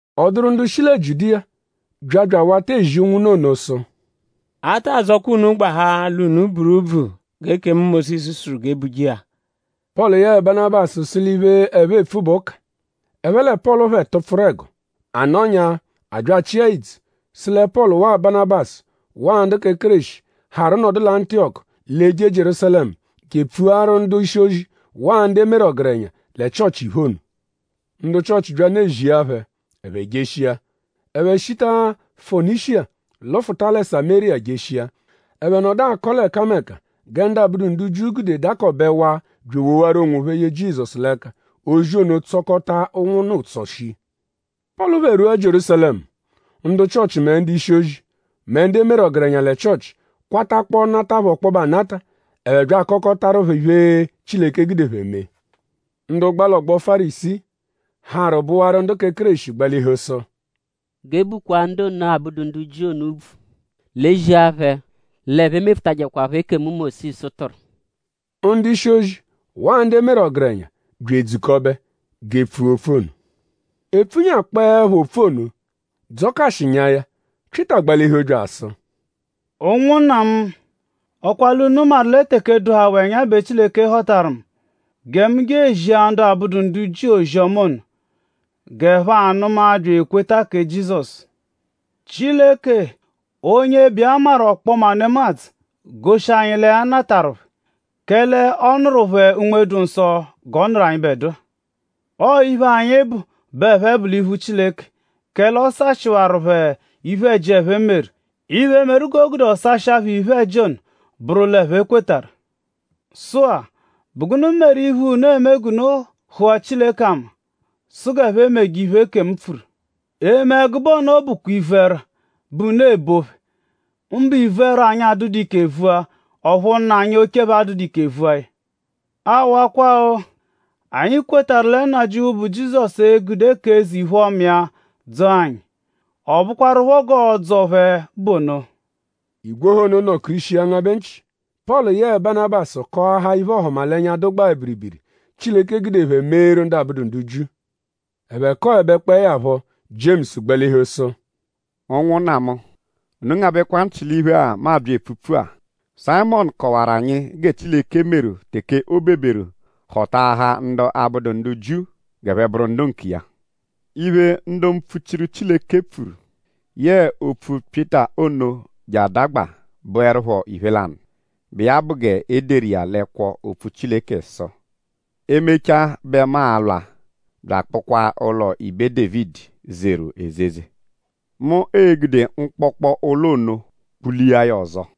Ọ dụru ndu shi lẹ Jiudiya bya bya awata ezi ụnwunna ono sụ: “A taa dzọkwa unu gbahaa l'unu buru úbvù g'ekemu Mósisu sụru g'e buje iya.” Pọlu yẹe Banabasu sụ l'iphe, ẹphe epfu bụ ụka. Ẹphe lẹ Pọlu phẹ tụpfuru ẹgo. A nọnyaa; a bya achịa idzu sụ lẹ Pọlu waa Banabasu waa ndu kẹ Kéreshi, harụ nọdu lẹ Antiyọku l'e-je Jierúsalẹmu je epfuaru ndu-ishi-ozi waa ndu e meru ọgerenya lẹ Chịochi iphe ono. Ndu Chịochi byanụ ezia phẹ; ẹphe jeshia. Ẹphe shita Fonishiya lụfuta lẹ Samériya jeshia. Ẹphe nọdu akọ l'ẹkameka gẹ ndu abụdu ndu Jiu gude dakọbewaa bya ewowaru onwophẹ ye Jizọsu l'ẹka. Ozi ono tsọkota ụnwunna ụtso shii. Pọlu phẹ rwua Jierúsalẹmu; ndu Chịochi mẹ ndu-ishi-ozi; mẹ ndu e meru ọgerenya lẹ Chịochi kwatakpọo nata phẹ ọkpobe anata. Ẹphe bya akọkotaru phẹ iphe, Chileke gude phẹ mee. Ndu gba l'ọgbo Fárisii, harụ bụwaru ndu kẹ Kéreshi gbalihu sụ: “G'e bukwaa ndu ono abụdu ndu Jiu ono úbvù. L'e zia phẹ l'ẹphe mefutajẹkwapho ekemu, Mósisu tụru.” Ndu-ishi-ozi waa ndu e meru ọgerenya bya edzukọbe g'e pfua opfu ono. E pfunyakpọoepho opfu ono; dzọkashinyaa ya; Pyịta gbalihu bya asụ: “Ụnwunna mu;?ọ kwa l'unu maru lẹ teke dụhawaa ẹnya bẹ Chileke họtajeru mu gẹ mu je ezia ndu abụdu ndu Jiu ozi-ọma ono g'ẹphe anụma bya ekweta kẹ Jizọsu. Chileke; onye bụ iya maru ọkpoma nemadzụ goshi anyi lẹ ya natarụ phẹ; kẹle ọ nụru phẹ Unme-dụ-Nsọ g'ọ nụru anyịbedua. Ọo iphe anyi bụ bẹ ẹphe bụ l'iphu Chileke; kẹle ọ sashịwaru phẹ iphe-ẹji, ẹphe meru. Iphe, meru g'o gude ọ sashịa phẹ iphe-ẹji ono bụru l'ẹphe kwetarụ. Sụ-a;?bụ gụnu meru iphe, unu eme g'unu hụa Chileke ama sụ g'ẹphe meje iphe, ekemu pfuru? Eme ẹgube ono bụkwa ivu-ẹrwa bẹ unu ebo phẹ; mbụ ivu-ẹrwa, anyi adụdu ike vua; ọphu nna anyi oche phẹ adụdu ike vua ya. Awakwa-o! Anyi kwetarụ lẹ Nnajịuphu, bụ Jizọsu e-gude k'eze-iphe-ọma iya dzọo anyi. Ọ bụkwarupho g'ọo-dzọ phẹ bụ ono.” Igwe ọha ono nọ-kirishia ngabẹ nchị. Pọlu yẹe Banabasu kọahaa iphe-ọhumalenya, dụgbaa biribiri, Chileke gude phẹ meeru ndu abụdu ndu Jiu. Ẹphe kọebekpoe ya phọ; Jiemusu gbalihu sụ: “Ụnwunna mu; unu ngabẹkwa nchị l'iphe-a, mu abya epfupfu-a. Sayịmonu kọwaru anyi gẹ Chileke meru teke o beberu họtaahaa ndu abụdu ndu Jiu g'ẹphe bụru ndu nkiya. Iphe, ndu mpfuchiru Chileke pfuru yẹe opfu Pyịta ono je adagba bụerupho iphe lanụ, bụ iya bụ g'e deru iya l'ẹkwo-opfu Chileke sụ: “E -mechaa bẹ mu a-lwa bya akpụkwaa ụlo ibe Dévidi, zeru ezeze. Mu e-gude mkpọkpo ụlo ono kpulia ya ọzo.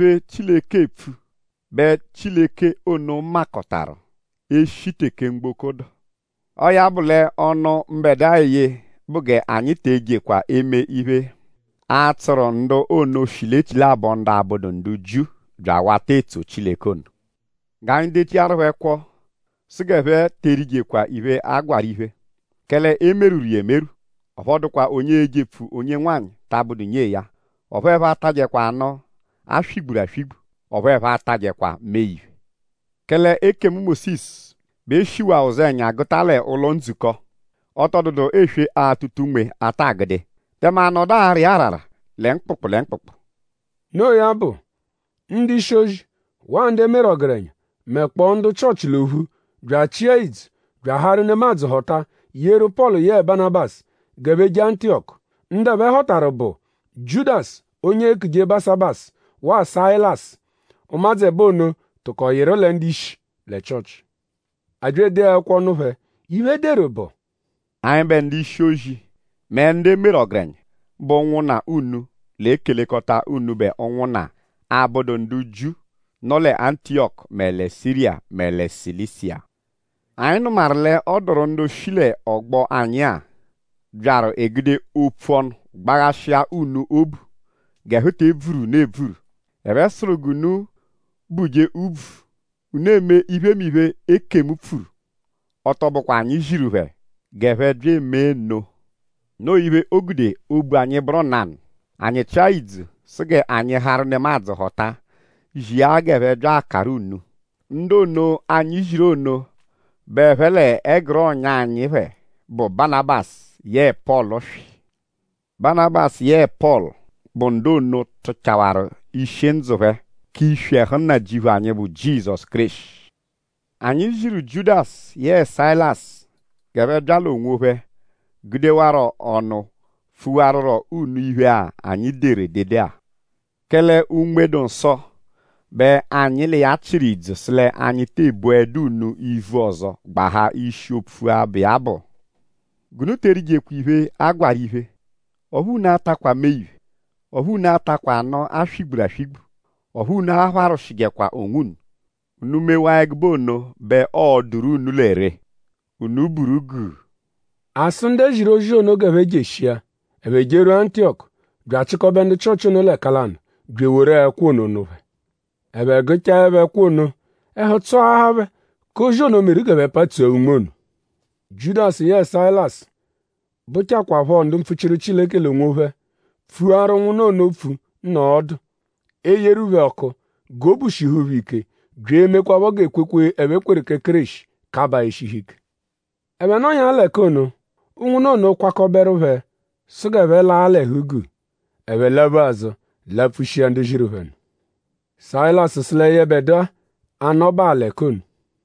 Iphemiphe, Chileke eepfu bẹ Chileke ono makọtaru e -shi teke mgboko dụ.” “Ọo ya bụ l'ọnu, mbẹdua eye bụ g'anyi te ejekwa eme iphe, a-tsụru ndu ono shi l'echilabọ ndu abụdu ndu Jiu bya awata etso Chileke ono. G'anyi dechiaru phẹ ẹkwo sụ g'ẹphe te erijekwa iphe, a gwarụ iphe; kẹle e merwuru iya emerwụ; ọphu ọ dụkwa onye ejepfuje onye nwanyị ta abụdu nyee ya; ọphu ẹphe atajẹkwa anụ, a swigburu aswigbu; ọphu ẹphe atajẹkwa mee-iphe. Kẹle ekemu Mósisu bẹ e shiwaa ụzenya gụta l'ụlo-ndzukọ. Ọ tọ dụdu eswe-atụta-unme, a ta agụdu iya. Tẹme a nọdu ara iya arara lẹ mkpụkpu lẹ mkpụkpu.” Noo ya bụ; ndu-ishi-ozi waa ndu e meru ọgerenya; mẹkpoo ndu Chịochi l'ophu bya achịa idzu bya aharu nemadzụ họta yeru Pọlu yẹe Banabasu g'ẹphe je Antiyọku. Ndu ẹphe họtaru bụ Jiudasu onye eekuje Basabasu waa Sayilasu. Ụmadzu ẹbo ono tụko yịru lẹ ndu-ishi lẹ Chịochi. A bya edee ẹkwo nụ phẹ. Iphe, e deru bụ: “Anyịbe ndu-ishi-ozi mẹ ndu e meru ọgerenya, bụ ụnwunna unu l'ekelekọta unubẹ ụnwunna, abụdu ndu Jiu, nọ lẹ Antiyọku mẹ lẹ Siriya; mẹ lẹ Silisiya. Anyi nụmaru l'ọ dụru ndu shi l'ọgbo anyi-a, byaru egude opfu ọnu gbaghashia unu obu g'ẹhu te ebvuru unu ebvuru. Ẹphe sụru g'unu buje úbvù; unu eme iphemiphe, ekemu pfuru. Ọ tọ bụkwa anyi ziru phẹ g'ẹphe bya eme nno. Noo iphe, o gude obu anyi bụru nanụ; anyi chịa ìdzù sụ g'anyi harụ nemadzụ họta zia g'ẹphe bya akaru unu. Ndu ono, anyi ziru ono bẹ ẹphe l'ẹguru ọ̀nyà anyi phẹ, bụ Banabasu yẹe Pọlu swị. Banabasu yẹe Pọlu bụ ndu ono, tụchawaru ishi ndzụ phẹ k'iswi ẹhu Nnajịuphu anyi, bụ Jizọsu Kéreshi. Anyi ziru Jiudasu yẹe Sayilasu g'ẹphe bya l'onwophẹ gudewarọ ọnu pfuwarurọ unu iphe-a, anyi deru edede-a. Kẹle Unme-dụ-Nsọ bẹ anyi l'iya chịru idzu sụ l'anyi tee boẹdu unu ivu ọzo gbahaa ishi opfu-a, bụ iya bụ: G'unu te erijekwa iphe, a gwarụ iphe; ọphu unu atakwa mee-iphe; ọphu unu atakwa anụ, a swigburu aswigbu; ọphu unu apharwụshijekwa onwunu. Unu -mewaa ẹgube ono bẹ ọo-dụru unu lẹ ree. Unu buru guu.” A sụ ndu e ziru ozi ono g'ẹphe jeshia. Ẹphe jerwua Antiyọku bya achịkobe ndu Chịochi ono l'ẹka lanụ bya eworu ẹkwo ono nụ phẹ. Ẹphe gụchaepho ẹkwo ono; ẹhu tsọahaa phẹ k'ozi ono, meru g'ẹphe patsua unme ono. Jiudasu yẹe Sayilasu, bụchakwaapho ndu mpfuchiru Chileke l'onwophẹ pfuaru ụnwunna ono opfu nọo ọdu; eyeru phẹ ọku g'obu shihu phẹ ike bya emekwaphọ g'ekwekwe, ẹphe kweru kẹ Kéreshi kabaa eshihu ike. Ẹphe nọnyaa l'ẹka ono; ụnwunna ono kwakọberu phẹ sụ g'ẹphe laa l'ẹhu-guu. Ẹphe laphu azụ lapfushia ndu ziru phẹ nụ. Sayilasu sụ lẹ yẹbedua a-nọbaa l'ẹka ono.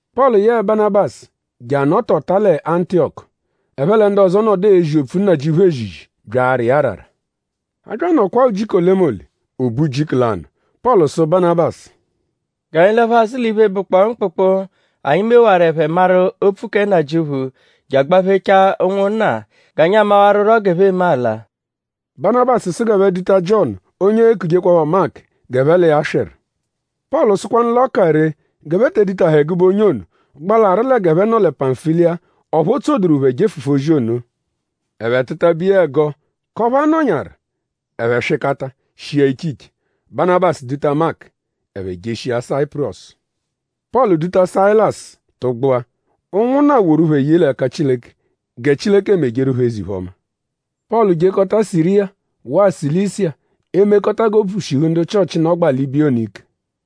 Pọlu yẹe Banabasu je anọtota lẹ Antiyọku. Ẹphe lẹ ndu ọzo nọdu ezi opfu Nnajịuphu ezizi bya ara iya arara. A bya anọkwaa ujiku olemole; o be ujiku lanụ; Pọlu sụ Banabasu: “G'anyi laphu azụ l'iphe, bụkpoo mkpụkpu, anyi mewaru ẹphe maru opfu kẹ Nnajịuphu je agbaphechaa ụnwunna g'anyi amawarụro g'ẹphe eme ala.” Banabasu sụ g'ẹphe duta Jiọnu onye eekujekwaphọ Maku g'ẹphe l'iya swịru. Pọlu sụkwanu l'ọ ka ree g'ẹphe te edutahẹ ẹgube onye ono, gbalarụ g'ẹphe nọ lẹ Pamfiliya; ọphu o tsoduru phẹ jefụfu ozi ono. Ẹphe tụ-tabe iya ẹgo k'ọphu a nọnyaru; ẹphe swịkata shia iche iche. Banabasu duta Maku; ẹphe jeshia Sayipurọsu. Pọlu duta Sayilasu tụgbua. Ụnwunna woru phẹ ye l'ẹka Chileke gẹ Chileke mejeru phẹ eze-iphe-ọma. Pọlu jekọta Siriya waa Silisiya; emekọta g'obu shihu ndu Chịochi, nọgbaa l'ibiya oo ike.